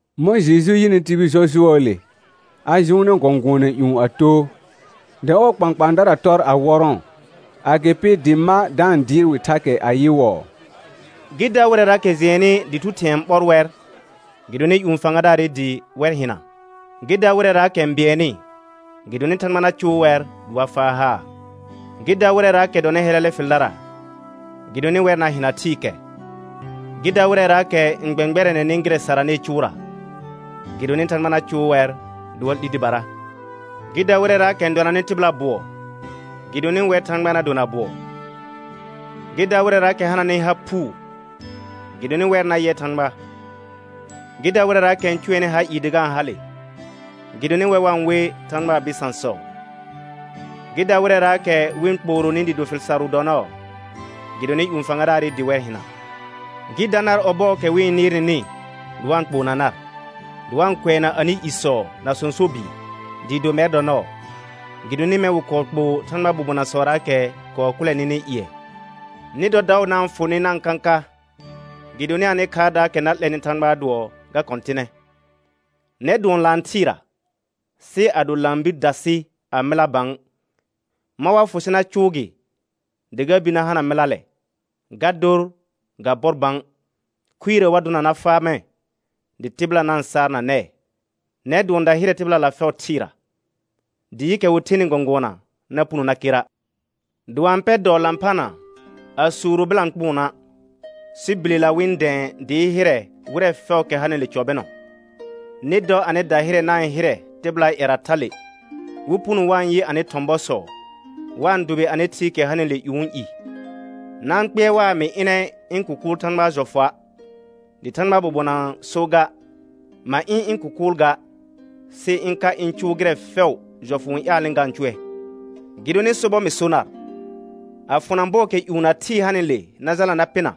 Mɔ̃ Jeju yɩnɩ tibil jɔjʋɔɔle, a jʋʋnɛ gɔ̃gʋɔna ƴũ a too, dɩ ɔɔ kpãkpãadara tɔr a wɔrɔ̃ɔ. Agɩpɩ dɩ ma da-n dɩɩr wɩ thakɛ ayɩwɔɔ: Gɩ da wɩrɛraakɛ jɩɛnnɩ dɩ thu thɩ̃ɛ n ɓɔr wɛr, gɩdonɩ ƴũ fãgadaarɩ dɩ wɛr hɩna. Gɩ da wɩrɛraakɛ n bɩɛnnɩ, gɩdonɩ Thãgba na cʋʋ wɛr dɩ wa faa haar. Gɩ da wɩrɛraakɛ dɔnɩ hɛlɛlɛ fɩldara, gɩdonɩ wɛr na hɩna thɩɩkɛ. Gɩ da wɩrɛraakɛ n gbɛ̃gbɛrɛnɛnɩ gɩrɛ saranɩɩ cʋʋra, gɩdonɩ Thãgba na cʋʋ wɛr dɩ wa 'li dɩbara. Gɩ da wɩrɛraakɛ n dɔnanɩ tɩbɩla bʋɔ, gɩdonɩ wɛr Thãgba na dona bʋɔ. Gɩ da wɩrɛraakɛ hananɩ ha phuu, gɩdonɩ wɛr na yɛ Thãgba. Gɩ da wɩrɛraakɛ n cʋɛnɩ ha ɩɩ dɩ ga-n hale, gɩdonɩ wɛr wa-n we Thãgbaa bɩsãsɔ. Gɩ da wɩrɛraakɛ wɩ-n kpooronɩ dɩɩ do fɩl sarʋ dɔ nɔɔ, gɩdonɩ ƴũ fãgadaarɩ dɩ wɛr hɩna. Gɩ da nar ɔbɔɔkɛ wɩ-n nɩɩr nɩnɩ dɩ wa-n kpoona nar, dɩ wa-n kʋɛna anɩ isɔ na sõso bɩɩ, dɩɩ do mɛr dɔ nɔɔ, gɩdonɩ mɛ̃ wɩ kɔɔ kpoo Thãgbaa bobonasɔraakɛ kɔɔ kʋlɛ nɩnɩ ƴɩɛ. Nɩ dɔ daʋ na-n fʋ nɩ na-n kãka, gɩdonɩ anɩ khaardaakɛ na 'lɛnɩ Thãgbaa dʋɔ, ga kɔ̃tɩnɛ. Nɛr dʋɔn laan thɩɩra, sɩ ado laan bir dasɩ a mɩla bã, mɔ̃ wa fʋ sɩ na cʋʋ gɩ dɩ ga bir na hana mɩlalɛ? Ga dor ga bɔr bã, khuirə wa dʋna na faa mɛ̃, dɩ tɩbɩla na-n saar na nɛɛ. Nɛr dʋɔn dahɩrɛ tɩbɩlala fɛʋ thɩɩra. Dɩɩkɛ wɩ thenɩ gɔ̃gʋɔna na puno na kera'. Dɩ wa-n pɛ dɔɔ lãphana a suuro bɩlãkpʋʋnna', sɩ bilela wɩ-n dɛ̃ɛ dɩɩ hɩrɛ wɩrɛ fɛʋʋkɛ hanɩle cɔ bɩnɔ. Nɩ dɔ anɩ dahɩrɛ na-n hɩrɛ tɩbɩlaa ƴɛra thale, wɩ puno wa-n yɩ anɩ thɔ̃ bɔsɔ, wa-n dʋbɩ anɩ Thɩɩkɛ hanɩle ƴũu i. Na-n kpɩɛr waa mɩ ɩnɛ ɩ̃ kʋkʋʋl Thãgbaa jɔfʋa', dɩ Thãgbaa bobonaa so ga. Ma ɩ̃ ɩ̃ kʋkʋʋl ga, sɩ ɩ̃ ka ɩ̃ cʋʋ gɩrɛ fɛʋ jɔfʋ n ƴaalnɩ ga-n cʋɛ. Gɩdonɩ sobɔr mɩ so nar, a fʋna bɔɔkɛ ƴũ na thɩɩ hanɩle na jalna na pɩna,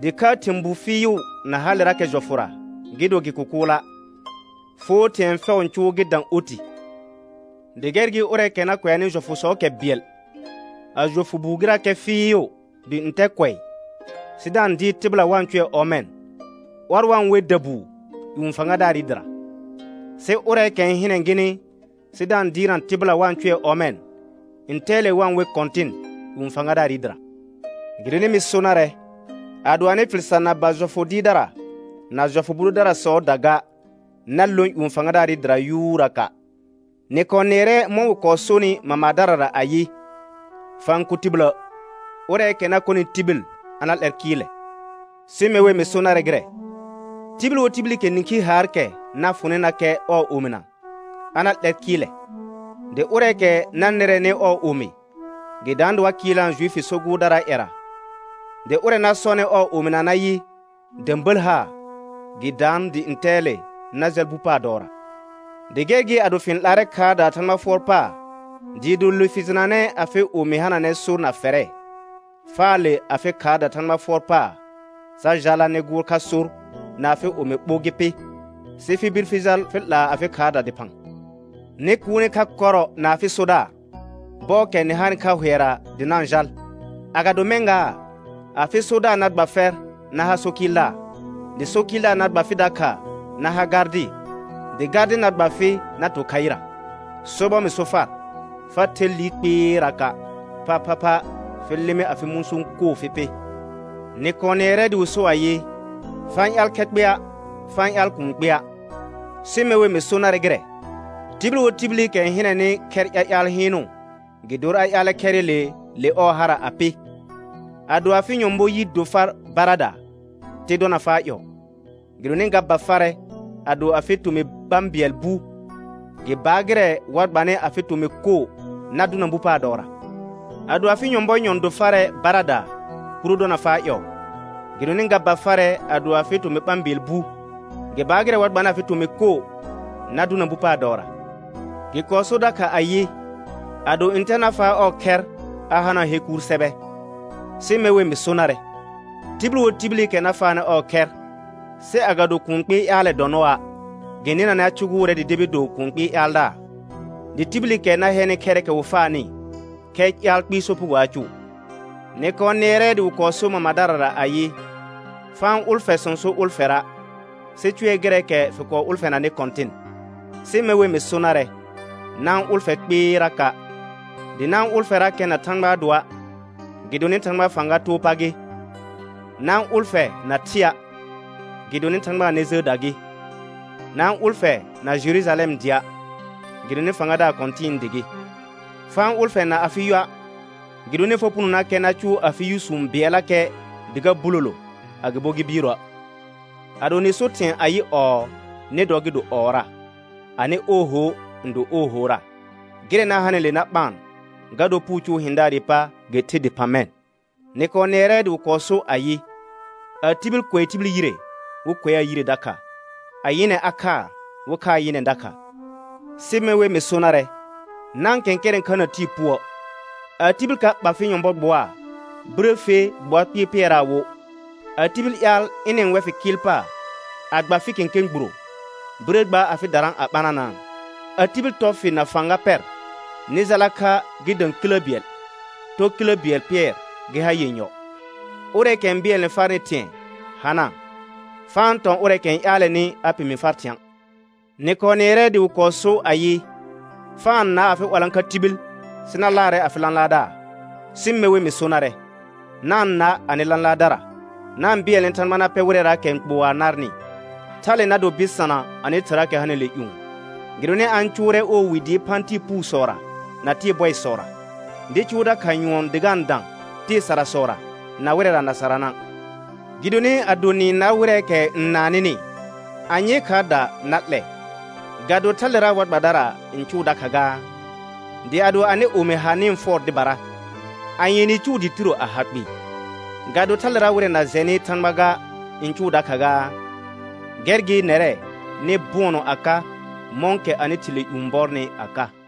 dɩkhaa thɩ̃ bu fɩɩʋ na halerakɛ jɔfʋra gɩ do gɩ kʋkʋʋla', foo thɩ̃ɛ fɛʋ n cʋʋ gɩ dã oti. Dɩ gɛr gɩ ʋrɛɛkɛ na kʋɛanɩ jɔfʋsɔɔkɛ bɩɛl, a jɔfʋ buu gɩrakɛ fɩɩʋ dɩ ntɛ kʋɛ, sɩ da-n dɩɩr tɩbɩla wa-n cʋɛ ɔmɛ̃, ɔr wa we dabuu ƴũ fãgadaarɩ dɩra, sɩ ʋrɛɛkɛ n hɩnɛ gɩnɩ sɩ da-n dɩɩrna tɩbɩla wa-n cʋɛ ɔmɛ̃, ntɛɛle wa-n we kɔ̃tɩn ƴũ fãgadaarɩ dɩra. Gɩdonɩ mɩ so narɛ, ado anɩ fɩl sar na ba jɔfʋ dɩɩrdara na jɔfʋ bʋ dʋdarasɔɔda ga, na lõ ƴũ fãgadaarɩ dɩra yuuraka'. Nɩ kɔɔ nɩɛrɛ mɔ̃ wɩ kɔɔ sonɩ mamadarara ayɩ: «Fa-n kʋ tibilə'.» Ʋrɛɛkɛ na kɔnɩ tibil, a na 'lɛr kɩɩlɛ. Sɩ me wer mɩ so narɛ gɩrɛ: Tibil wo tibilikɛ nĩkhi haar, kɛ na fʋnɩnakɛ ɔɔ omina, a na 'lɛr kɩɩlɛ. Dɩ ʋrɛɛkɛ na nɩrɛnɩ ɔɔ omi, gɩ daan dɩ wa kɩɩlnaa Juifi so gʋʋrdaraa ƴɛra, dɩ ʋrɛ na sɔnɩ ɔɔ omina nayɩ, də̃bəl haa, gɩ daan dɩ ntɛɛle na jal bu paar dɔɔra. Dɩ gɛr gɩ ado fɩ-n 'laarɛ khaardaa Thãgba fʋɔr paar dɩɩ do le fɩ jɩnanɛ afɩ omi hananɛ sor na fɛrɛ, faa le afɩ khaarda Thãgba fʋɔr paar sa jala nɩ gʋʋr kha sor na afɩ omi ɓo gɩ pɩ, sɩ fɩ bir fɩ jal fɩ 'laa afɩ khaarda dɩphã. Nɩ kuune kha kɔrɔ na afɩ sodaar, bɔɔkɛ nɩ hanɩ kha hʋɛra dɩ na-n jal. Agado mɛ̃ gaa, afɩ sodaar na gba fɛr na ha so kɩɩldaar, dɩ so kɩɩldaar na gba fɩ dakha na ha gardɩ, dɩ gardɩ na gba fɩ na to khaɩra. Sobɔr mɩ so far, fa the liir kpɩɩraka', phaphapha fɩ lɩmɩ afɩ mũsũ koo fɩ pɩ. Nɩ kɔɔ nɩɛrɛ dɩ wɩ so ayɩ: «Fa-n ƴaal khɛ kpɩa', fa-n ƴaal kuun kpɩa'.» Sɩ me wer mɩ so narɛ gɩrɛ: Tibil wo tibilikɛ n hɩnɛnɩ khɛr ƴaƴaal hɩɩnʋ, gɩ dor a ƴaalɛ khɛrɩle le ɔɔ hara a pɩ. Ado afɩ nyɔ̃bɔ yi do far baradaa, te dɔna faa ƴɔɔ, gɩdonɩ ga ba farɛ ado afɩ tomɩ ɓã bɩɛl bu, gɩ baar gɩrɛ wa gbanɩ afɩ tomɩ koo na dʋna bu paar dɔɔra. Ado afɩ nyɔ̃bɔ nyɔ̃ do farɛ baradaa, kuro dɔna faa ƴɔɔ, gɩdonɩ ga ba farɛ ado afɩ tomɩ ɓã bɩɛl bu, gɩ baar gɩrɛ wa gbanɩ afɩ tomɩ koo na dʋna bu paar dɔɔra. Gɩ kɔɔ sor dakha ayɩ: «Ado ntɛ na faa ɔɔ khɛr a hanaa he kuur sɛbɛ.» Sɩ me wer mɩ so narɛ: Tibil wo tibilikɛ na faanɩ ɔɔ khɛr, sɩ agado kũu kpɩɩ ƴaalɛ dɔ nɔa', gɩ nɩnanɛ a cʋgʋʋrɛ dɩ debi do kũu kpɩɩ ƴaaldaar, dɩ tibilikɛ na hɛnɩ khɛrɩkɛ wɩ faanɩ, khɛ ƴaal kpɩɩ sopugo a cʋʋ. Nɩ kɔɔ nɩɛrɛ dɩ wɩ kɔɔ so wo mamadarara ayɩ: «Fa-n ʋlfɛ sõso ʋlfɛra', sɩ cʋɛ gɩrɛɛkɛ fɩ kɔɔ ʋlfɛnanɩ Kɔ̃tɩn.» Sɩ me wer mɩ so narɛ: Na-n ʋlfɛ kpɩɩraka', dɩ na-n ʋlfɛrakɛ na Thãgbaa dʋɔa', gɩdonɩ Thãgbaa fãga too pa gɩ. Na-n ʋlfɛ na thɩa', gɩdonɩ Thãgbaa nɛ jəəda gɩ, na-n ʋlfɛ na Jerujalɛm dɩa', gɩdonɩ Fãgadaar kɔ̃tɩ̃ɩ dɩ gɩ. Fa-n ʋlfɛ na afɩ yʋa', gɩdonɩ fa punonakɛ na cʋʋ afɩ yʋsũ bɩɛllakɛ dɩ ga bulolo, agɩbo gɩ biiroə'. Ado nɩ so thɩ̃ɛ ayɩ, ɔɔ, nɩ dɔ gɩ do ɔɔra; anɩ ooho n do oohora, gɩrɛ na hanɩle na ɓaan, ga dor puu cʋʋ hɩ̃daarɩ pa gɩ the dɩphã mɛ̃. Nɩ kɔɔ nɩɛrɛ dɩ wɩ kɔɔ so ayɩ: «A tibil kʋɛ tibil yire, wɩ kʋɛaa yire dakha. A nyɩnɛ a khaa, wɩ khaa nyɩnɛ dakha.» Sɩ me wer mɩ so narɛ: Na-n kɛ̃kɛrɛ̃ kha na tɩɩ puə'. A tibil ka ɓa fɩ nyɔ̃bɔ gbʋaa, birə fe gbʋa kpɩɩ pɩɛraa wo. A tibil ƴaal ɩnɩ-n wɛ fɩ kɩɩl paar a gba fɩ kẽkẽ gburo, birə gba afɩ darã a ɓananaa. A tibil tɔ fɩ na fãga pɛr nɩ jala kha gɩ dã kilə bɩɛl, tɔ kilə bɩɛl pɩɛr gɩ ha yenyɔ. Ʋrɛɛkɛ n bɩɛlnɛ farnɩ thɩ̃ɛ hanaa, fa-n tɔ̃ ʋrɛɛkɛ n ƴaalɛnɩ a pemi far thɩ̃a'. Nɩ kɔɔ nɩɛrɛ dɩ wɩ kɔɔ so ayɩ: «Fa-n na afɩ 'walãkha tibil,» sɩ na laarɛ afɩ lãlaardaar. Sɩ me wer mɩ so narɛ: Na-n na anɩ lãlaardara, na-n bɩɛlnɛ Thãgba na pɛ wɩrɛraakɛ n kpoa narnɩ. Thale na do bɩsana anɩ Thɩraakɛ hanɩle ƴũ, gɩdonɩ a-n cʋʋrɛ ɔɔ wi dɩɩ phã tɩɩ puusɔra na tɩɩ bɔɩsɔra, dɩ cʋʋ dakha nyʋɔn dɩ ga-n dã tɩɩ sarasɔra na wɩrɛra na sarana'. Gɩdonɩ ado nɩ-n nar wɩrɛɛkɛ n naan nɩnɩ, anyee khaarda na 'lɛ? Ga do thalera war gbadara n cʋʋ dakha gaa? Dɩ ado anɩ omi ha nɩ-n fʋɔr dɩbara, anye nɩ cʋʋ dɩɩ tiro a ha kpɩɩ? Ga do thalera wɩrɛ na jɛnɩ Thãgba ga n cʋʋ dakha gaa? Gɛr gɩ nɛrɛ nɩ bʋɔnɔ a ka, mɔ̃kɛ anɩ Thɩ le ƴũ bɔrnɩ a ka.